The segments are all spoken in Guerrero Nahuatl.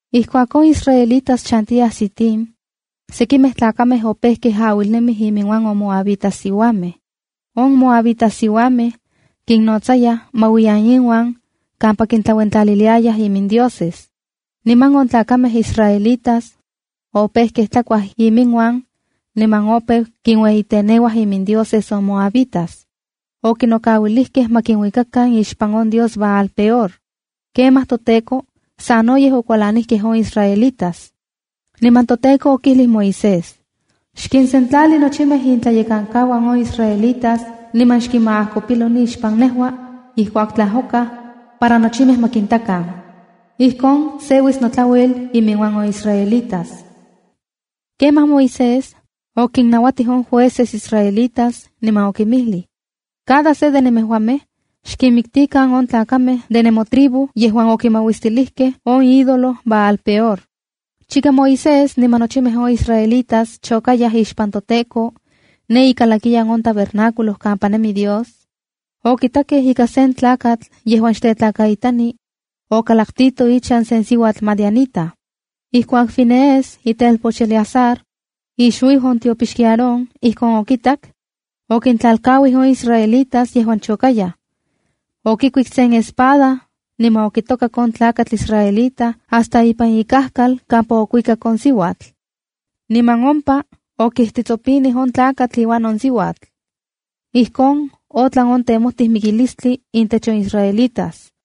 Ijkuak on israelitas chantiyaj Sitim, sekimej tlakamej opejkej auilnemij iminuan on moabitas siuamej. On moabitas siuamej kinnotsayaj ma uiyan inuan kampa kintlauentlaliliayaj imindioses. Niman on tlakamej israelitas opejkej tlakuaj iminuan niman opeu kinueyiteneuaj imindioses on moabitas. Ijkon okinokauilijkej ma kinuikakan ixpan on dios Baal-peor. Kemaj toTEKO sanoyej okualanijkej on israelitas. Niman toTEKO okijlij Moisés: —Xkinsentlali nochimej intlayekankauan on israelitas niman xkinmaajkopilo nixpan nejua ijkuak tlajokaj para nochimej ma kintakan. Ijkon seuis notlauel iminuan on israelitas. Kemaj Moisés okinnautij on jueces israelitas, niman okinmijlij: —Cada se de nemejuamej xkinmiktikan on tlajkamej de nemotribu yejuan okimauistilijkej on ídolo Baal-peor. Chika Moisés niman nochimej on israelitas chokayaj ixpan toTEKO ne ikalakiyan on tabernáculo kampa nemi Dios, okitakej ika sen tlakatl yejuan xtetlakaitani okalaktito ichan sen siuatl madianita. Ijkuak Finees, itelpoch Eleazar, ixuiu on tiopixki Aarón, ijkon okitak, okintlalkauij on israelitas yejuan chokayaj. Okikuik sen espada, niman okitokak on tlakatl israelita hasta ipan ikajkal kampa okuikak on siuatl. Niman ompa okijtitsopinij on tlakatl iuan on siuatl. Ijkon otlan on temojtij mikilistli intech on israelitas.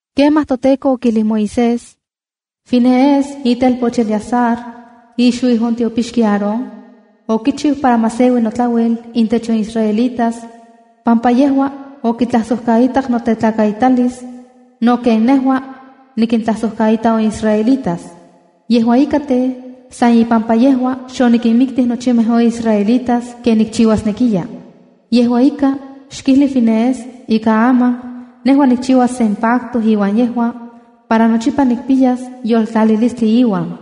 Kemaj toTEKO okijlij Moisés: —Finees, itelpoch Eleazar, ixuiu on tiopixki Aarón, okichiu para ma seui notlauel intech on israelitas, pampa yejua okitlajsojkaitak notetlakaitalis, no ken nejua nikintlajsojkaita on israelitas. Yejua ika tej, san ipampa yejua, xonikinmiktij nochimej on israelitas ken nikchiuasnekiya. Yejua ika, xkijli Finees ika aman nejua nikchiuas sen pacto iuan yejua, para nochipa nikpiyas yoltlalilistli iuan.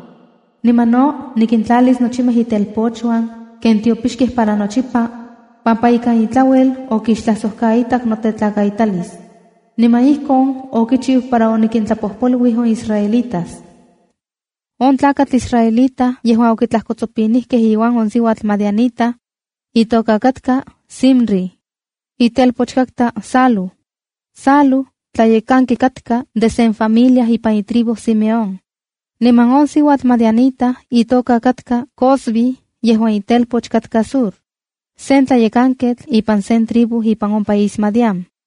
Niman no nikintlalis nochimej itelpochuan ken tiopixkej para nochipa, pampa ikan itlauel okixtlajsojkaitak notetlakaitalis. Niman ijkon okichiu para onikintlapojpoluij on israelitas. On tlakatl israelita yejuan okitlajkotsopinijkej iuan on siuatl madianita, itoka katka Zimri, itelpoch katka Salú. Salú tlayekanketl katka de sen familia ipan itribu Simeón. Niman on siuatl madianita itoka katka Cozbi yejuan ichpoch katka Zur, sen tlayekanketl ipan sen tribu ipan on país Madián.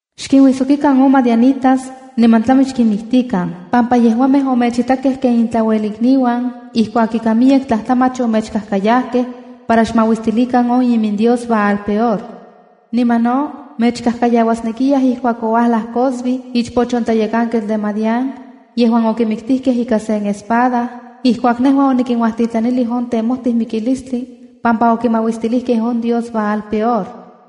—Xkinuijsokikan on madianitas niman tlami xkinmiktikan, pampa yejuamej omechitakej ken intlauelikniuan ijkuak ika miyek tlajtlamach omechkajkayajkej para xmauistilikan on imindios Baal-peor. Niman no mechkajkayauasnekiyaj ijkuak ouajlaj Cozbi, ichpoch on tlayekanketl de Madián, yejuan okimiktijkej ika sen espada ijkuak nejua onikinuajtitlanilij on temojti mikilistli pampa okimauistilijkej on dios Baal-peor.